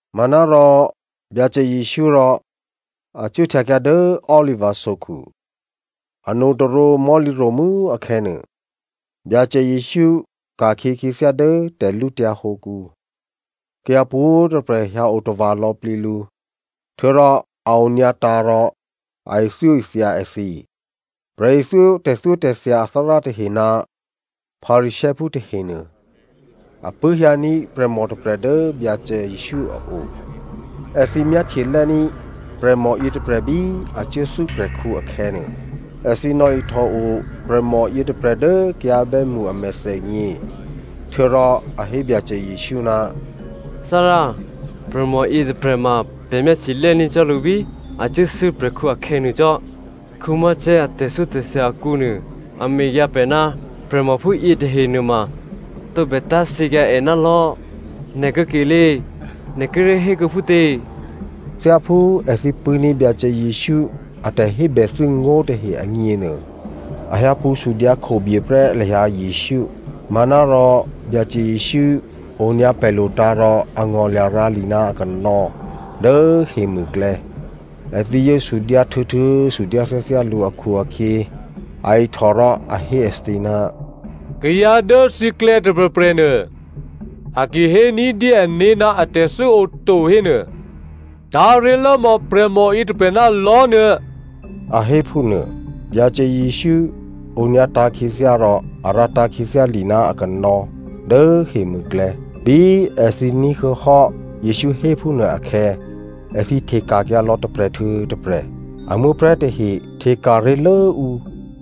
Manárò Byacè Jesǔ rò a cuốhtyakyǎ dố Oliva sokhu. Anotôrǒ mò̤́lǐro̤mû́ akhè̌nuô, Byacè Jesǔ ka̤khyě khyěthyá dố tè̤lǔtyǎ hǒkǔ. Kayǎ pwǒ̤꤮ tôprè̤ hyǎ otava̤ lò̌plǐ lǔ. Htuô̌rò a onyǎtǎ̤ rò a ithyóithya èthǐ. Prè̤ithyó tè̤thyótè̤thya athárá tahe ná Pharisěophú tahenuô a pṳ̂́hyǎní̤ prè̤mò tôprè̤ dố Byacè Jesǔ a o. Èthǐ myáhtye lè́ní̤ prè̤mò yětôprè̤ bí a cuốthû́ prè̤khǔ akhè̌nuô. Èthǐ nò̌ihtòo prè̤mò yětôprè̤ dố kayǎ bè́mṳ a mèthènyě. Htuô̌rò a hé Byacè Jesǔ, “Thárá, prè̤mò yětôprè̤ ma pè̤ myáhtye lè́ní̤ cò́ lǔ bí a cuốthû́ prè̤khǔ akhè̌nuô cò́. Mosè a tè̤thyótè̤thya akǔnuô, a mekyǎ pè̤ ná prè̤mò phúyě tahe nuôma tǒbè tá̤thyěkyǎ è ná lò̤́. Nè̤ kuô̌kelé꤮, nè̤ kíré̤ hékuô̌ phútě?” Thyáphú èthǐ pṳ̂́ní̤ Byacè Jesǔ a tè̤hébèthû́ ngó̤ tahe agněnuô, a hyǎpṳ̌ sudyǎ khobyeprè́ lahyǎ Jesǔ. Manárò Byacè Jesǔ onyǎ palo̤tǎ̤ rò a ngò̤lya̤ rǎ li ná akanò̌ dố hemûklè̌. Èthǐ yǒ sudyǎ htuô̌htuô̌ sudyǎ thyáthyá lǔ akhu-akhyě, a ihtò rò a hé èthǐ, “Kayǎ dố thǐklè̌ tôprè̤prè̤ nuô, a ki hé ní̤dyé ané̤ ná atè̤thû́ oto hénuô, tá̤ ré̤lốmò̌ prè̤mò yětôprè̤ ná lò̤́ nuô,” a hé phúnuô. Byacè Jesǔ onyǎtǎ̤ khyěthyá rò a rǎtǎ̤ khyěthyá li ná akanò̌ dố hemûklè̌. Bí èthǐ ní̤huô̌hò́ Jesǔ héphúnuô akhè̌, èthǐ hteka̤kyǎ lò̌ tôprè̤ htuô̌ tôprè̤. A muố̤prè̤́ tahe hteka̤ ré̤lố ǔ.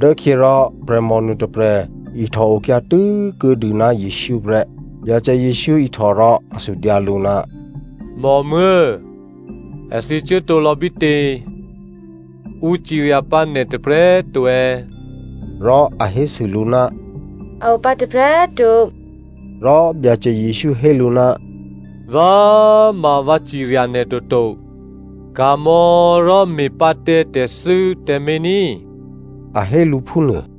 Dốkhyě rò prè̤mò nuôtôprè̤ ihtò okyǎ tû́kuô̌dû ná Jesǔ prè́. Byacè Jesǔ ihtò rò a sudyǎ lǔ, “Mòmuố̤, èthǐ cuốtǒlò̌ bítě? Ǔ cirya pǎ nè̤ tôprè̤꤮ to è̌?” Rò a hésû lǔ, “A opǎ tôprè̤꤮ to.” Rò Byacè Jesǔ hé lǔ, “Vǎ ma꤮ vǎ cirya nè̤ toto. Ka̤mò̌ rò me̤pǎ tǎ tè̤thû́ tǎmé̤ ní꤮,” a hé lǔ phúnuô.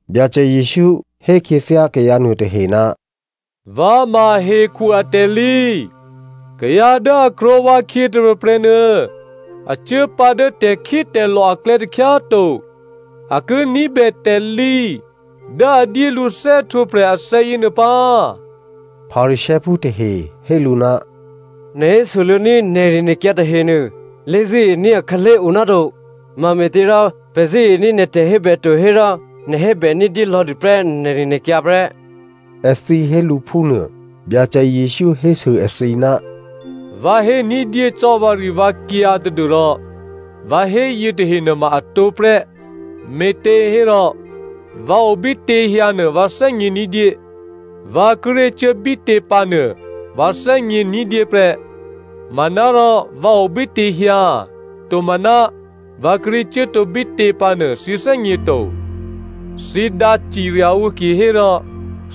Byacè Jesǔ hé khyěthyá kayǎ nuôtahe, “Vǎ ma hekhu atè̤lǐ. Kayǎ dố a krwǒ vǎkhyě tôprè̤prè̤ nuô, a cuố pǎ dố tè̤khítè̤lò̤ aklè̌ takhyá꤮ to. A ki ní̤bè tè̤lǐ dố a dyé lǔ thè́htwǒprè̤ athè̌ yěnuô pǎ.” Pharisěophú tahe hé lǔ, “Nè̤ hésoluô̌ ní̤ nè̤rinè̤kyǎ tahenuô lé̤zṳ̂́ení̤ akhǎlé̤ o náto. Mame̤těrò pè̤ zṳ̂́ení̤ nè̤ tè̤hébè to hérò nè̤ hébè ní̤dyé lò̌dû prè́ nè̤rinè̤kyǎ prè́,” èthǐ hé lǔ phúnuô. Byacè Jesǔ hésû èthǐ, “Vǎ hé ní̤dyé cò́ vǎrivǎkyǎ tadû́rò vǎ hé yětahe nuôma atǒ prè́ me̤těhérò vǎ obítěhyǎ nuô vǎ thè́gně ní̤dyé, vǎ kíré̤ cuố bítě pǎ nuô vǎ thè́gně ní̤dyé prè́. Manárò vǎ obítěhyǎ, tomaná, vǎ kíré̤ cuốtǒ bítě pǎnuô thǐ thè́gně to. Thǐ dǎcirya ǔ kihérò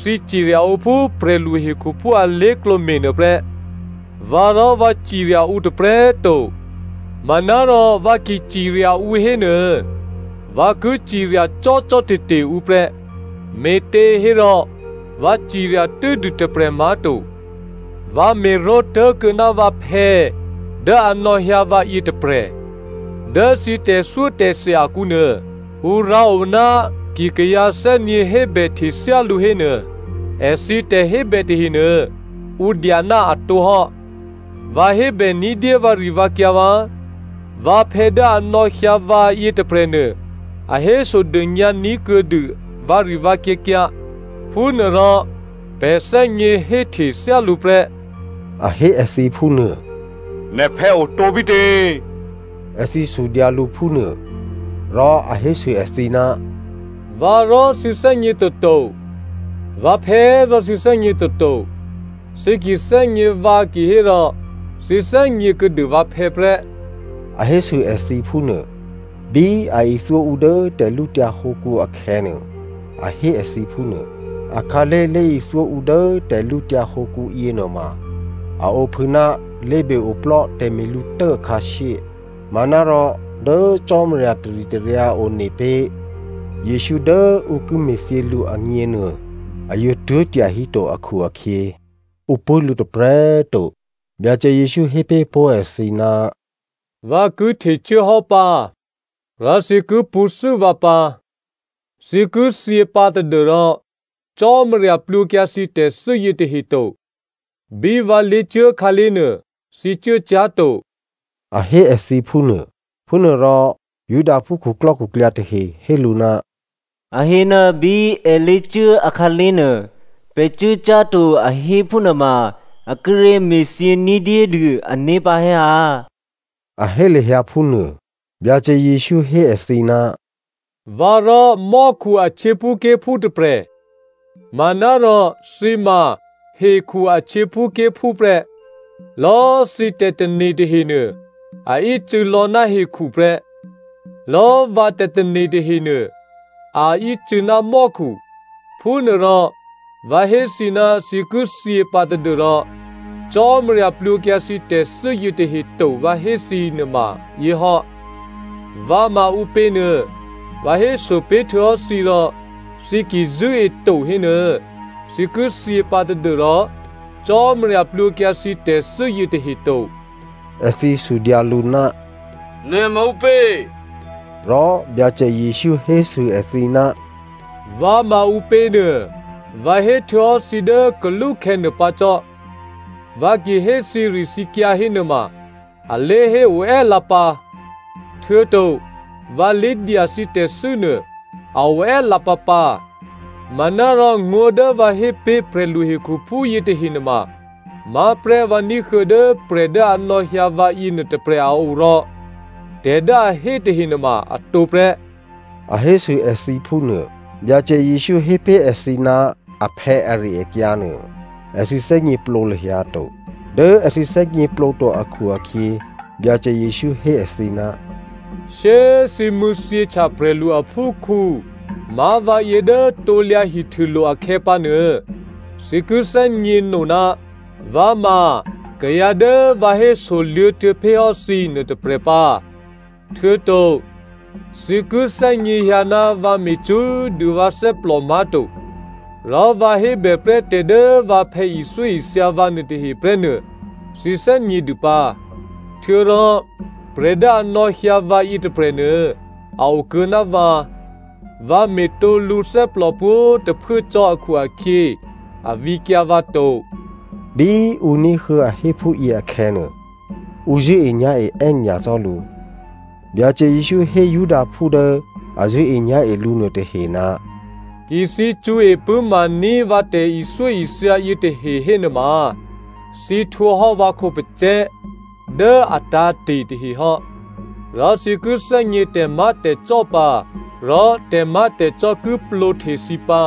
thǐ cirya ǔ phú prè̤lu hekhuphú alé̤klǒ me̤nuô prè́. Vǎ rò vǎ cirya ǔ tôprè̤꤮ to. Manárò vǎ ki cirya ǔ hénuô, vǎ ki cirya cò́cò́te̤te̤ ǔ prè́, me̤těhérò vǎ cirya tû́dû tôprè̤ má̤to. Vǎ me̤ró̤ tố̤kuô̌ ná vǎphè̌ dố a nò̌hyǎ vǎ yětôprè̤. Dố thǐ tè̤thyótè̤thya akǔ nuô, ǔ rǎo ná ki kayǎ thè́nyě̤ hébèhte thyálǔ hénuô, èthǐ tè̤hébè tahenuô ǔ dya ná a tǒhò́. Vǎ hébè ní̤dyé vǎrivǎkyǎ vǎ. Vǎphè̌ dố a nò̌hyǎ vǎ yětôprè̤nuô, a hésodônyǎ ní̤kuô̌dû vǎrivǎkyǎkyǎ, phúnuôrò pè̤ thè́gně héhte thyálǔ prè́.” A hé èthǐ phúnuô. “Nè̤phè̌ otǒ bítě?” Èthǐ sudyǎ lǔ phúnuô. Rò a hésû èthǐ, “Vǎ rò thǐ thè́gně toto, vǎphè̌ rò thǐ thè́gně toto. Thǐ ki thè́gně vǎ kihérò thǐ thè́gně kuô̌dû vǎphè̌ prè́.” A hésû èthǐ phúnuô. Bí a ithyó ǔ dố tè̤lǔtyǎ hǒkǔ akhè̌nuô, a hé èthǐ phúnuô. Akhǎlé̤ lé̤ithyó ǔ dố tè̤lǔtyǎ hǒkǔ yěnuôma, a ophû ná lé̤be-oplò́ tè̤me̤lǔtố akhǎshyé. Manárò dố Cò́marya taritaryǎ one pé̤ Jesǔ dố ǔ ki me̤thyě lǔ agněnuô, a yǒ tuố̤ tyahíto akhu-akhyě, ǔ pṳ̂́ lǔ tôprè̤꤮ to. Byacè Jesǔ hé pé̤ pó̤ èthǐ, “Vǎ ki htecuốhò́ pǎ, rò thǐ ki pṳ̌thû́ vǎ pǎ. Thǐ ki thyě pǎ tadû́rò Cò́marya plwǒkyǎ thǐ tè̤thû́ yětahe to. Bí vǎ lé̤cuố khǎlé̤ nuô thǐ cuốcyá̤to,” a hé èthǐ phúnuô. Phúnuôrò Judaphú khuklò́khuklyǎ tahe hé lǔ, “A hé ná bí èlé̤cuố akhǎlé̤ nuô, pè̤ cuốcyá̤to a hé phúnuôma a kíré̤ me̤thyě ní̤dyédû ané̤ pǎ è̌ ha?” A hé lahyǎ phúnuô. Byacè Jesǔ hé èthǐ, “Vǎrò mò́khu a htyěphúké̤phú tôprè̤, manárò thǐ ma hekhu a htyěphúké̤phú prè́. Lò̌꤮ thǐ tè̤tane̤ tahenuô, a ícû̌ lò̌ ná hekhu prè́. Lò̌꤮ vǎ tè̤tane̤ tahenuô, a ícû̌ ná mò́khu. Phúnuôrò, vǎ hé thǐ ná thǐ ki thyě pǎ tadû́rò Cò́marya plwǒkyǎ thǐ tè̤thû́ yětahe to vǎ hé thǐ nuôma yěhò́. Vǎ ma ǔpěnuô vǎ héso pé̤htuô̌hò́ thǐ rò thǐ ki zṳ̂́eto hénuô, thǐ ki thyě pǎ tadû́rò Cò́marya plwǒkyǎ thǐ tè̤thû́ yětahe to.” Èthǐ sudyǎ lǔ, “Nè̤ ma ǔpě?” Rò Byacè Jesǔ hésû èthǐ, “Vǎ ma ǔpěnuô, vǎ héhtuô̌hò́ thǐ dố kalúkhè̌ nuôpǎ cò́. Vǎ ki hé thǐrithǐkyǎ hénuôma, a lé̤hé oè́lǎpǎ, htuô̌to vǎ lé̤dya thǐ tè̤thû́ nuô, a oè́lǎpǎpǎ. Manárò ngó̤ dố vǎ hé pé̤ prè̤lu hekhuphú yětahe nuôma má̤prè́ vǎ ní̤huô̌ dố prè̤ dố a nò̌hyǎ vǎ yěnuô tôprè̤ a o rò tè̤ dố a hé tahe nuôma a tǒprè́,” a hésû èthǐ phúnuô. Byacè Jesǔ hé pé̤ èthǐ ná aphè̌ ari-akyǎ nuô, èthǐ thè́gněplǒ lahyǎ to. Dố èthǐ thè́gněplǒto akhu-akhyě Byacè Jesǔ hé èthǐ, “Shyé꤮ thǐ mṳ̂̌thyěhtya prè̤lu aphúkhǔ má̤ vǎyě dố krusu díkè hihtûlo̤ akhè̌pǎnuô, thǐ ki thè́gněno ná vǎ ma kayǎ dố vǎ hésoluô̌ htuô̌pé̤hò́ thǐ nuôtôprè̤ pǎ. Htuô̌to thǐ ki thè́gněhyǎ ná vǎ me̤ cṳ́꤮ dû vǎ thè́plò má̤to, rò vǎ hébèprè́ tè̤ dố vǎphè̌ ithyóithya vǎ nuôtahe prè́ nuô thǐ thè́gnědû pǎ. Htuô̌rò prè̤ dố a nò̌hyǎ vǎ yětôprè̤nuô, a okuô̌ ná vǎ. Vǎ me̤tǒ lǔthè́plò pwǒ̤꤮ tôphuố cò́ akhu-akhyě a vǐkyǎ vǎ to.” Bí ǔ ní̤huô̌ a hé phúyě akhè̌nuô, ǔ zṳ̂́enyá̤e è́nyacò́ lǔ. Byacè Jesǔ hé Judaphú dố a zṳ̂́enyá̤e lǔ nuôtahe, “Ki thǐ cṳ̌e pṳ̂́maní̤ vǎ tè̤ithyóithya yětahe hénuôma, thǐ htwǒhò́ vǎ khǒpacè̤̌ dố a tǎ̤te̤ tahe hò́. Rò thǐ ki thè́gně tè̤má̤tè̤cò́ pǎ. Rò tè̤má̤tè̤cò́ ki plwǒhte thǐ pǎ,”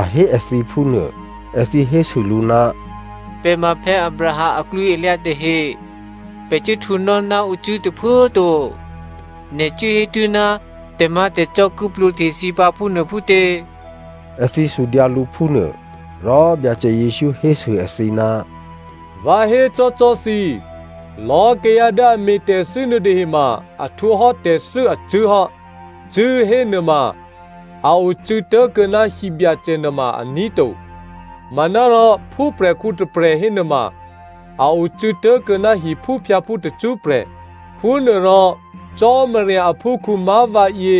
a hé èthǐ phúnuô. Èthǐ hésû lǔ, “Pè̤ ma Abraham aklwǐalyǎ tahe, pè̤ cuốhtwǒnò́ ná ǔcṳ̂́ tôphuố꤮ to. Nè̤ cuố hé tuố̤ ná tè̤má̤tè̤cò́ ki plwǒhte thǐ pǎ, phúnuô phútě?” Èthǐ sudyǎ lǔ phúnuô. Rò Byacè Jesǔ hésû èthǐ, “Vǎ hécò́cò́ thǐ, lò̌꤮ kayǎ dố a me̤ tè̤thû́ nuôtahe ma a htwǒhò́ tè̤thû́ acṳ̂́hò́. Cṳ̂́ hénuôma, a ocû̌ tố̤kuô̌ ná hibyacè nuôma aní̤ to. Manárò phúprè̤khǔ tôprè̤ hénuôma, a ocû̌ tố̤kuô̌ ná hiphúphyǎphú tacṳ́prè̤. Phúnuôrò Cò́marya aphúkhǔ má̤ vǎyě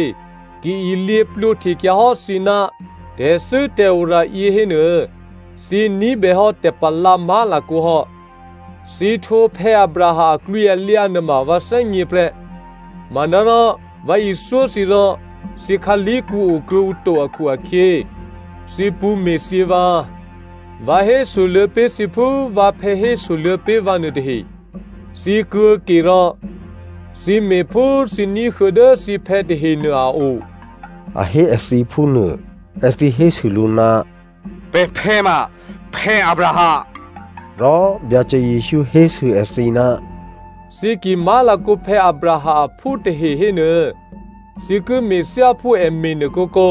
ki ilyě plwǒhtekyǎ hò́ thǐ ná tè̤thû́tè̤ora yě hénuô, thǐ ní̤bèhò́ tè̤palǎ má̤lakǒ hò́. Thǐ htwǒ Abraham aklwǐalyǎ nuôma vǎ thè́gně prè́. Manárò vǎ ithyó thǐ rò thǐ khǎlèkǔ okuô̌ǔ to akhu-akhyě, thǐ pṳ̌me̤thyě vǎ. Vǎ hésoluô̌ pé̤ thǐ phú vǎphè̌ hésoluô̌ pé̤ vǎ nuôtahe. Thǐ kuô̌ke rò, thǐ me̤ phú thǐ ní̤huô̌ dố thǐphè̌ tahenuô a o.” A hé èthǐ phúnuô. Èthǐ hésû lǔ, “Pè̤phè̌ ma Abraham.” Rò Byacè Jesǔ hésû èthǐ, “Thǐ ki má̤lakǒ Abraham aphú tahe hénuô, thǐ ki me̤ thyáphú è me̤nuô kǒkǒ.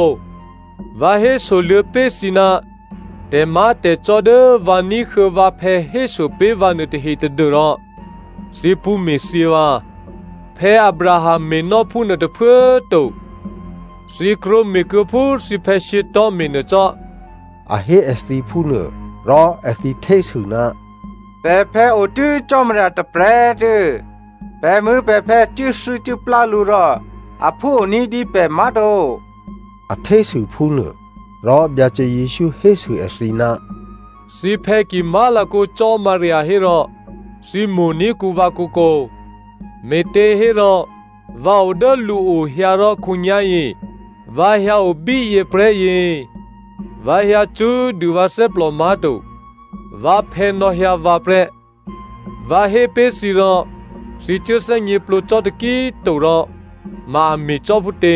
Vǎ hésoluô̌ pé̤ thǐ ná tè̤má̤tè̤cò́ dố vǎ ní̤huô̌ vǎphè̌ hésopé̤ vǎ nuôtahe tadû́rò thǐ pṳ̌me̤thyě vǎ. Abraham me̤nò́ phúnuô tôphuố꤮ to. Thǐ krwǒme̤kuô̌ phú thǐphè̌ shyětò̤́ me̤nuô cò́,” a hé èthǐ phúnuô. Rò èthǐ htésû, “Pè̤phè̌ otû́ Cò́marya tôprè̤꤮ tuô̌. Pè̤muố̤pè̤phè̌ cuốthû́cuốplá lǔ rò aphú o ní̤dyé pè̤ má̤to.” A htésû phúnuô. Rò Byacè Jesǔ hésû èthǐ, “Thǐphè̌ ki má̤lakǒ Cò́marya hérò thǐ mo̤ní̤kǔ vǎ kǒkǒ, me̤těhérò vǎ o dố lǔo hyǎ rò khǒnyá̤yě vǎ hyǎo bíyěprè́yě. Vǎ hyǎ cṳ́꤮ dû vǎ thè́plò má̤to, vǎphè̌ nò̌hyǎ vǎ prè́. Vǎ hé pé̤ thǐ rò thǐ cuố thè́gněplǒ cò́ taki꤮ to rò ma a me̤ cò́ phútě?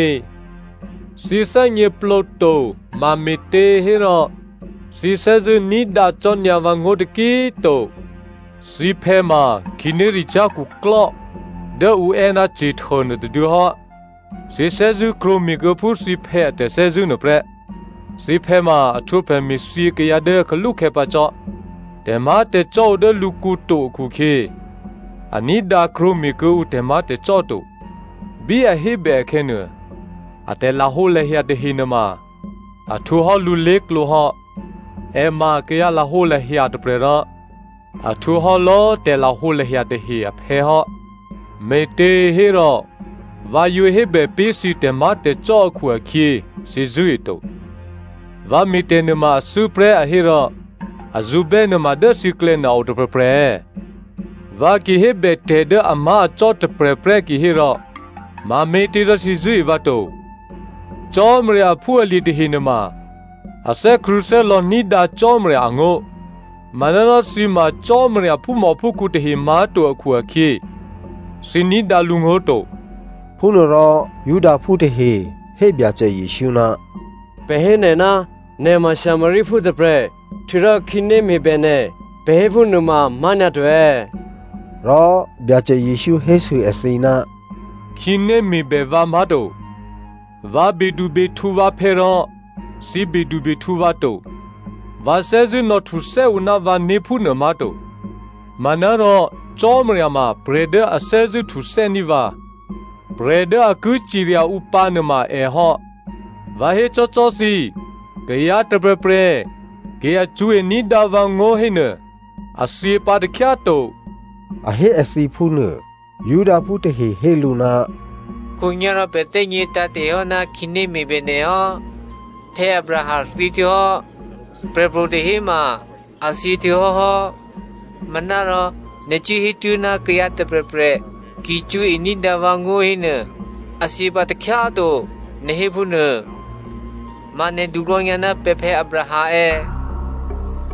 Thǐ thè́gněplǒ to mame̤těhérò thǐ thè́zṳ̂́ ní̤dǎ cò́nyǎ vǎngó̤ taki꤮ to. Thǐphè̌ ma khǐnéricyá̤ khuklò́ dố ǔ è́ ná Satan nuôtôduô̌ hò́. Thǐ thè́zṳ̂́ krwǒme̤kuô̌ phú thǐphè̌ a tè̤thè́zṳ̂́ nuôprè́. Thǐphè̌ ma a htwǒ prè̤me̤thyě kayǎ dố kalúkhè̌ pǎ cò́. Tè̤má̤tè̤cò́ o dố lǔkǔ to akhu-akhyě, a ní̤dǎ krwǒme̤ kuô̌ǔ tè̤má̤tè̤cò́ to. Bí a hébè akhè̌nuô, a tè̤lahǒlahya tahe nuôma a htwǒ hò́ lǔ lé̤klǒ hò́. È ma kayǎ lahǒlahya tôprè̤ rò a htwǒ hò́ lò̌꤮ tè̤lahǒlahya tahe aphè̌ hò́. Me̤těhérò vǎ yǒ hébè pé̤ thǐ tè̤má̤tè̤cò́ akhu-akhyě, thǐ zṳ̂́e to. Vǎ me̤tè̤ nuôma a thû́prè́ a hé rò a zṳ̌bè́ nuôma dố thǐklè̌ nuô a otôprè̤prè̤ è̌? Vǎ ki hébètè̤ dố amá̤acò́ taheprè́ kihérò mame̤tě rò thǐ zṳ̂́e vǎ to. Cò́marya aphúalye̤ tahe nuôma a thè́krṳ̂̌thè́lò̌ ní̤dǎ Cò́marya angó̤. Manárò thǐ ma Cò́marya phúmòphúkhǔ tahe má̤to akhu-akhyě, thǐ ní̤dǎ lǔngó̤ to.” Phúnuôrò Judaphú tahe hé Byacè Jesǔ, “Pè̤ hé nè̤, nè̤ ma Samariaphú tôprè̤, htuô̌rò khǐné me̤bè nè̤, pè̤ héphúnuô ma amá̤nyǎto è̌?” Rò Byacè Jesǔ hésû èthǐ, “Khǐné me̤bè vǎ má̤to, vǎ bedubehtǔ vǎphè̌ rò thǐ bedubehtǔ vǎ to. Vǎ thè́zṳ̂́ nò̌htuthè́ ǔ ná vǎné̤ phúnuô má̤to. Manárò Cò́marya ma prè̤ dố a thè́zṳ̂́ htuthè́ní̤ vǎ. Prè̤ dố a ki cirya ǔ pǎnuôma è hò́. Vǎ hécò́cò́ thǐ, kayǎ tôprè̤prè̤ ki a cṳ̌e ní̤dǎ vǎngó̤ hénuô, a thyěpǎ takhyá꤮ to,” a hé èthǐ phúnuô. Judaphú tahe hé lǔ, “Khǒnyá̤rò pè̤ thè́gně tǎ̤te̤hò́ ná khǐné me̤bè nè̤ hò́. Abraham thyěhtuô̌hò́, prè̤pro̤ tahe꤮ ma a thyě htuô̌hò́hò́. Manárò nè̤ cuốhétuố̤ ná kayǎ tôprè̤prè̤ ki cṳ̌e ní̤dǎ vǎngó̤ hénuô, a thyěpǎ takhyá꤮ to, nè̤ hé phúnuô. Ma nè̤ duklò̌nyǎ ná pè̤phè̌ Abraham è̌?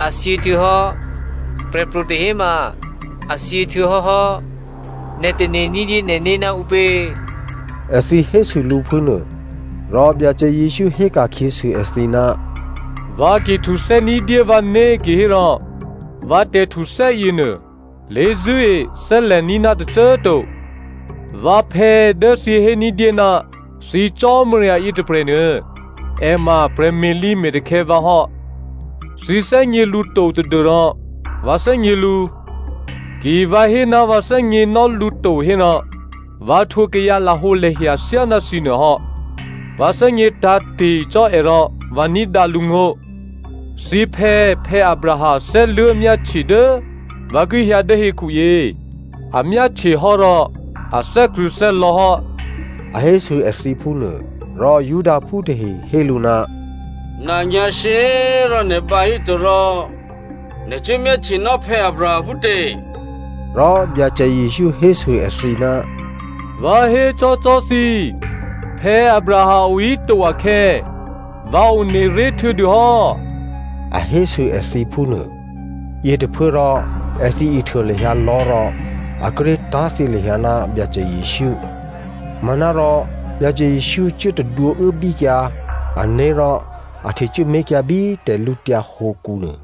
È thyě htuô̌hò́, prè̤pro̤ tahe꤮ ma a thyě htuô̌hò́hò́. Nè̤ tane̤ ní̤dyé nè̤né̤ ná ǔpě?” Èthǐ hésû lǔ phúnuô. Rò Byacè Jesǔ héka̤khyěsû èthǐ, “Vǎ ki htuthè́ ní̤dyé vǎné̤ kihérò vǎ tè̤htuthè́ yěnuô, lé̤zṳ̂́e thè́lè̤ní̤ ná tôcô꤮ to. Vǎphè̌ dố thǐ hé ní̤dyé ná thǐ Cò́marya yětôprè̤nuô, è ma prè̤me̤lǐ me̤takhè̌ vǎ hò́. Thǐ thè́gně lǔ to tadû́rò vǎ thè́gně lǔ. Ki vǎ hé ná vǎ thè́gněnò́ lǔ to hérò, vǎ htwǒ kayǎ lahǒlahya thyáná thǐnuô hò́. Vǎ thè́gně tǎ̤te̤ cò́ è rò vǎ ní̤dǎ lǔngó̤. Thǐphè̌ Abraham thè́luố̤ myáhtye dố vǎ ki hyǎ dố hekhu yě. A myáhtyehò́ rò a thè́krṳ̂̌thè́lò̌ hò́,” a hésû èthǐ phúnuô. Rò Judaphú tahe hé lǔ, “Nanyǎ̤shyě꤮ rò nè̤ bǎ híto rò nè̤ cuố myáhtyenò́ Abraham phútě?” Rò Byacè Jesǔ hésû èthǐ, “Vǎ hécò́cò́ thǐ, Abraham ohíto akhè̌, vǎ one ré̤ htuô̌dû hò́,” a hésû èthǐ phúnuô. Yětôphuốrò èthǐ ihtuô lahyǎ lò̤́ rò a kíré̤ tá̤thyě lahyǎ ná Byacè Jesǔ. Manárò Byacè Jesǔ cuố tadwǒuốbíkyǎ ané̤ rò a htecuốmé̤kyǎ bí tè̤lǔtyǎ hǒkǔnuô.